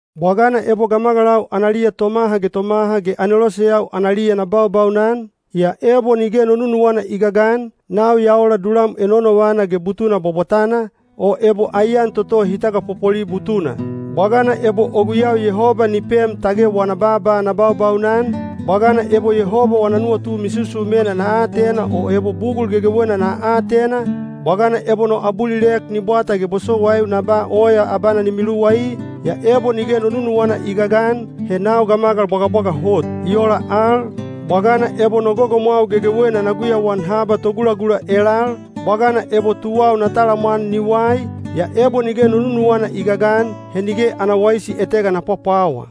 Bwagana ebo gamagalau analiya tomaha ge tomaha ge aneloseyau analiya na baubaunan, yaa ebo nige no nunuwana i gagan, nau ya ola dulam enonovana ge butuna bwabwatana, o ebo aiyan toto hi tagapopoli butuna. Bwagana ebo o guyau Yehoba ni pem tage wana baaba na baubaunan, bwagana ebo Yehoba wana nuwatu misusumena na atena o ebo bugul gegewena na atena, bwagana ebo no abulilek ni bwata ge bosowaiu na ba oya abana ni miluwai, yaa ebo nige no nunuwana i gagan, he nau gamagal bwagabwaga hot. I ola al, bwagana ebo no gogomwau gegewena na guyauan haba togulagula elal, bwagana ebo tuwau na talamwan ni wai, yaa ebo nige no nunuwana i gagan, he nige ana waisi etega na pwapwawa.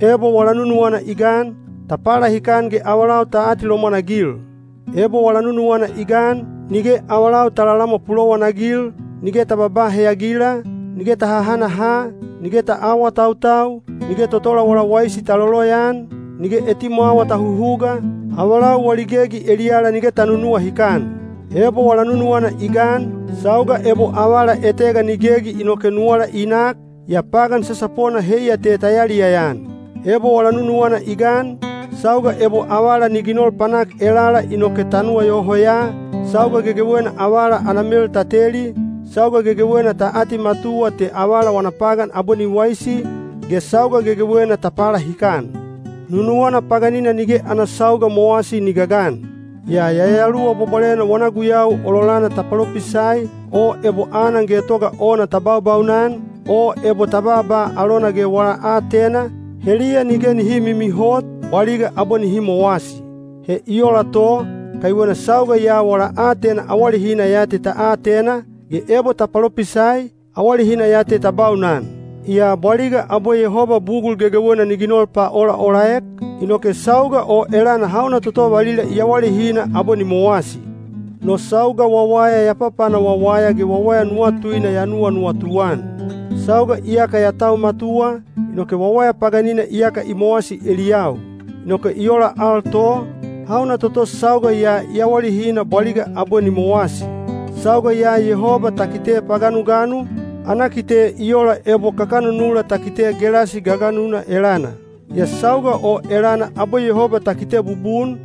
Ebo wala nunuwana i gan, ta palahikan ge avalau ta atilomwan-agil. Ebo wala nunuwana i gan, nige avalau ta lalamwa pulowanagil, nige ta babaa heyagila, nige ta hahanaha, nige ta aawatautau, nige totola wala waisi ta loloyaan, nige etimwawa ta huhuga, avalau wali gegi eliyala nige ta nunuwahikan. Ebo wala nunuwana i gan, sauga ebo avala etega ni gegi inoke nuwala i nak, yaa pagan sasapona heiya te ta yaliyaya-an. Ebo wala nunuwana i gan, sauga ebo avala ni ginol panak elala inoke ta nuwayoho ya, sauga gegewena avala ana mel ta teli, sauga gegewena ta atimatuwa te avala wana pagan abwe ni waisi, ge sauga gegewena ta palahikan. Nunuwana paganina nige ana sauga mowasi ni gagan. Yaa Yayaluwa Bwabwalena wana guyau ololana ta palopisai, o ebo anan getoga ona ta baubaunan, o ebo ta baaba alona ge wala aatena, heliya nige nihi mimihot, bwaliga abwe nihi mowasi. He i ola to, kaiwena sauga ya wala aatena awalehina ya te ta atena, ge ebo ta palopisai, awalehina ya te ta baunan. Yaa bwaliga abwe Yehoba bugul gegewena ni ginol paolaolaek, inoke sauga o elana hauna toto valila i awalehina abwe ni mowasi. No sauga wawaya ya papana wawaya ge wawaya nuwatuina ya nuwanuwatu-an. Sauga iyaka ya tau matuwa, inoke wawaya paganina iyaka i mowasi eliyau. Inoke i ola al to, hauna toto sauga ya i awalehina bwaliga abwe ni mowasi. Sauga ya Yehoba ta kite paganuganu, ana kite i ola ebo kakanunula ta kite gelasi gaganuna elana. Yaa sauga o elana abwe Yehoba ta kite bubun,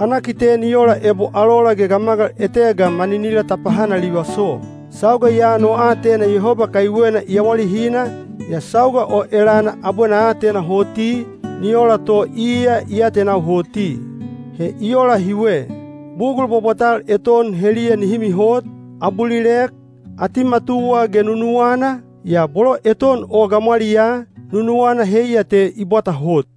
ana kite ni ola ebo alola ge gamagal etega maninila ta pahanalivaso. Sauga ya no aatena Yehoba kaiwena i awalehina, yaa sauga o elana abwe na atena hoti, ni ola to iya i atenau hoti. He i ola hiwe. Bugul bwabwatal eton heliya nihi mihot, abulilek, atimatuwa ge nunuwana, yaa bolo eton o gamwaliyaa, nunuwana heiya te i bwata hot.